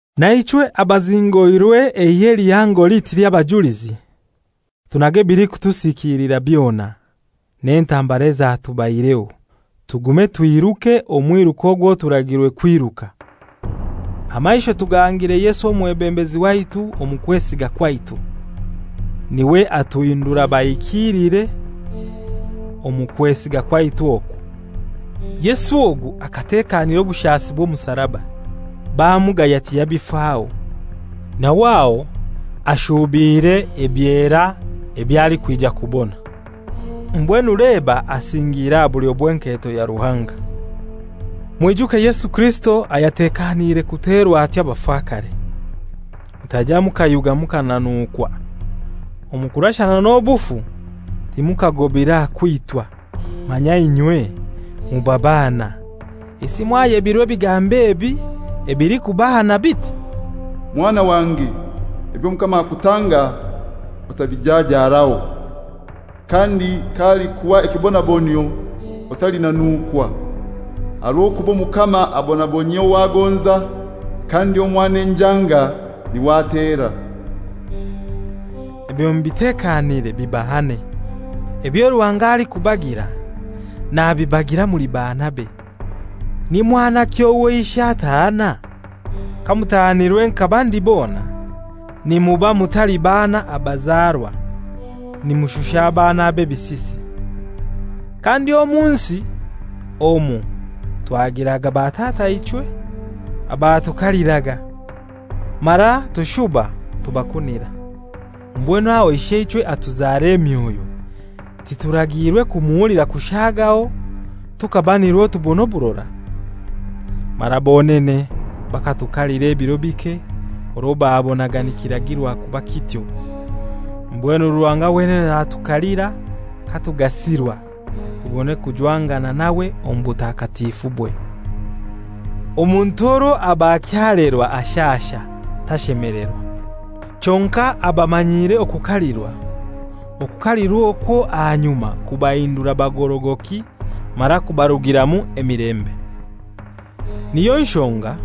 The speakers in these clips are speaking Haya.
Na ichwe, abazingoirwe eihe lihango liti ly'abajulizi, tunage ebilikutusikilira byona, n'entambara ezatubaireho, tugume twiruke omwiruko ogwo turagirwe kwiruka, amaisho tugahangire Yesu omwebembezi waitu omu kwesiga kwaitu, n'iwe atuhindura bahikilire omu kwesiga kwaitu okwo. Yesu ogu akatekanira obushasi bw'omusaraba, bamugaya tiyabifaho, nawe aho ashuubiire ebyera eby'alikwija kubona. Mbwenu leba asingiire aha bulyo bw'enketo ya Ruhanga. Mwijuke Yesu Kirisito ayatekaniire kuterwa atyo abafakare, mutaija mukayuga mukananukwa. Omu kurashana n'obufu timukagobire aha kwitwa. Manya inywe muba baana! Isi mwayebirwe ebigambo ebi ebilikubahana biti, «Mwana wange, eby'Omukama akutanga otabijajaaraho, kandi k'alikuha ekibonabonyio otalinanukwa. Aha rw'okuba Omukama abonabonyia ow'agonza, kandi omwana enjanga n'iwe atera.» Ebyo mubitekanire bibahane. Ebyo Ruhanga alikubagira nabibagira muli baanabe. Ni mwanaki owo ishe atahana? Kamutahanirwe nka bandi bona nimuba mutali baana abazarwa, nimushusha abaana b'ebisisi. Kandi omu nsi omu twagiraga batataichwe abatukaliraga, mara tushuba tubakunira. Mbwenu aho Isheichwe atuzara emyoyo tiragiirwe kumuhulira kushaagaho tukaba nirwo tubona oburora? Mara bonene bakatukalira ebiro bike orwo babonaga nikiragirwa kuba kityo. Mbwenu Ruhanga wenene natukalira katugasirwa, tubone kujwangana nawe omu butakatifubwe. Omuntu orwo aba akyalerwa ashasha, tashemelerwa. Kyonkai abamanyire okukalirwa, okukalirwa okwo ahanyuma kubahindura bagorogoki mara kubarugiramu emilembe. Niyo nshonga,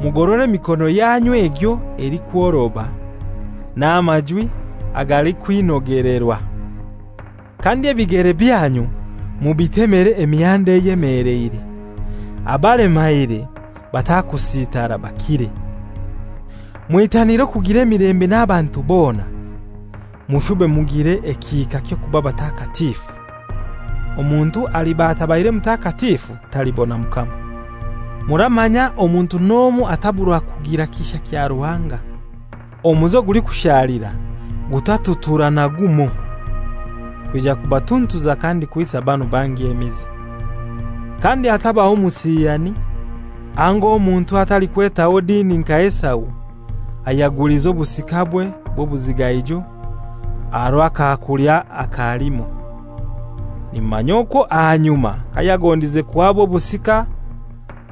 mugorore emiikono yanyu egyo elikworoba, n'amajwi agalikwinogelerwa. Kandi, ebigere byanyu mubitemere emihanda eyemeleire, abalemaire batakusitara, bakire. Mwitanire okugira emilembe n'abantu bona. Mushube mugire ekihika ky'okuba batakatifu; Omuntu aliba atabaire mutakatifu talibona Mukama. Muramanya omuntu n'omoi ataburwa kugira kisha kya Ruhanga. «Omuzi ogulikushalira» gutaturura na gumoi, kwija kubatuntuza kandi kwisa banu bangi emize. Kandi hatabaho musiyani, anga omuntu atalikwetaho dini nka Esau ayagulize obusikabwe bw'obuzigaijo aha rw'akakulya aka limoi. Nimumanya okwo ahanyuma kayagondize kuhaba obusika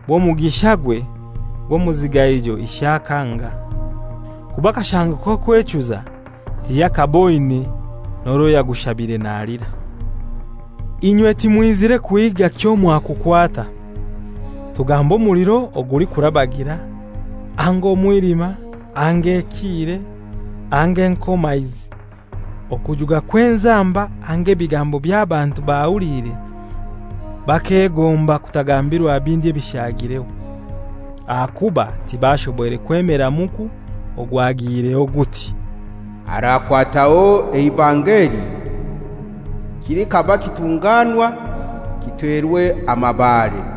bw'omugishagwe gw'omuzigaijo ishe akanga, kuba akashango k'okwechuza tiyakaaboine, n'orwo yagushabire nalira. Inywe timwizire kuhiiga kyomwakukwata: Tugambe omuliro ogulikurabagira, anga omwilima, anga ekiire, anga enkomaizi, okujuga kw'enzamba, anga ebigambo eby'abantu bahuliire bakegomba kutagambirwa bindi ebishaagireho. Ahakuba tibashoboire kwemera muku ogwagiireho guti, «Arakwataho eibanga eli, kilikaba kitunganwa, kiterwe amabaare.»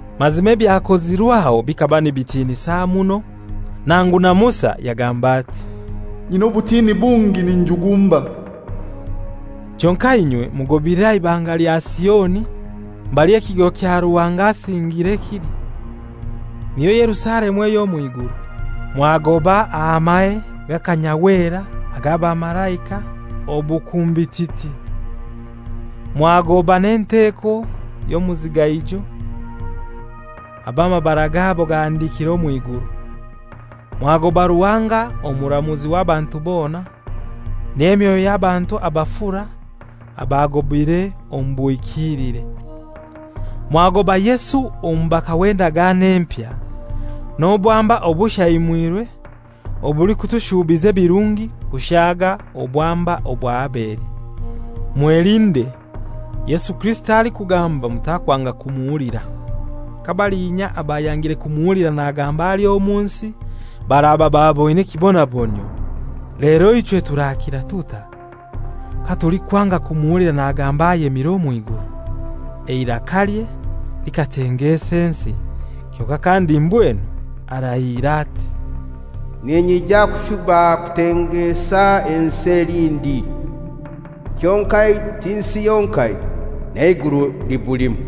Mazima ebyakozirw'aho bikaba nibitinisa muno nangu na Musa yagamba ati, «Nyina obutini bungi, ninjugumba.» Kyonkai inywe mugobire aha Ibanga lya Sioni mbali ekigo kya Ruhanga asingire kili, niyo Yerusalemu ey'omw'iguru. Mwagoba aha mahe g'akanyahwera ag'abamalaika obukumbititi. Mwagoba n'enteko y'omuzigaijo, ab'amabara gabo gahandikire omw'iguru. Mwagoba Ruhanga omuramuzi w'abantu bona, n'emyoyo y'abantu abafura abagobire omu buhikilire. Mwagoba Yesu omubaka w'Endagano Empya, n'obwamba obushaimwirwe obulikutushubiza ebirungi kushaaga obwamba obwa Abeli. Mwelinde, Yesu Kirisito alikugamba mutakwanga kumuhulira. Kabalinya abayangire kumuhulira nagamba ali omu nsi baraba baboine ekibonabonyio, lero ichwe turakira tutai katulikwanga kumuhulira nagamba ayemire omw'iguru! Eirakalye likatengeesa ensi; kyonkai kandi mbwenu arahiire ati, «Ninyija kushuba kutengeesa ensi elindi; kyonkai ti nsi yonkai, n'Eiguru libulimu.»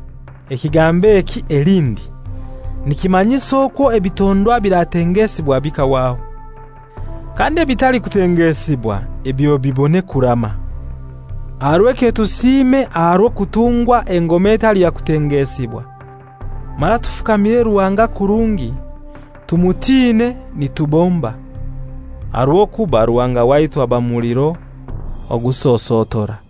Ekigambo eki «Elindi» nikimanyisa okwo ebitondwa ebiratengeesibwa bikahwaho. Kandi ebitalikutengeesibwa ebyo bibone kurama. Aha rw'ekyo tusiime aha rw'okutungwa engoma etali ya kutengeesibwa, mara tufukamire Ruhanga kurungi, tumutiine nitubomba, aha rw'okuba Ruhanga waitu aba muliro ogusosotora.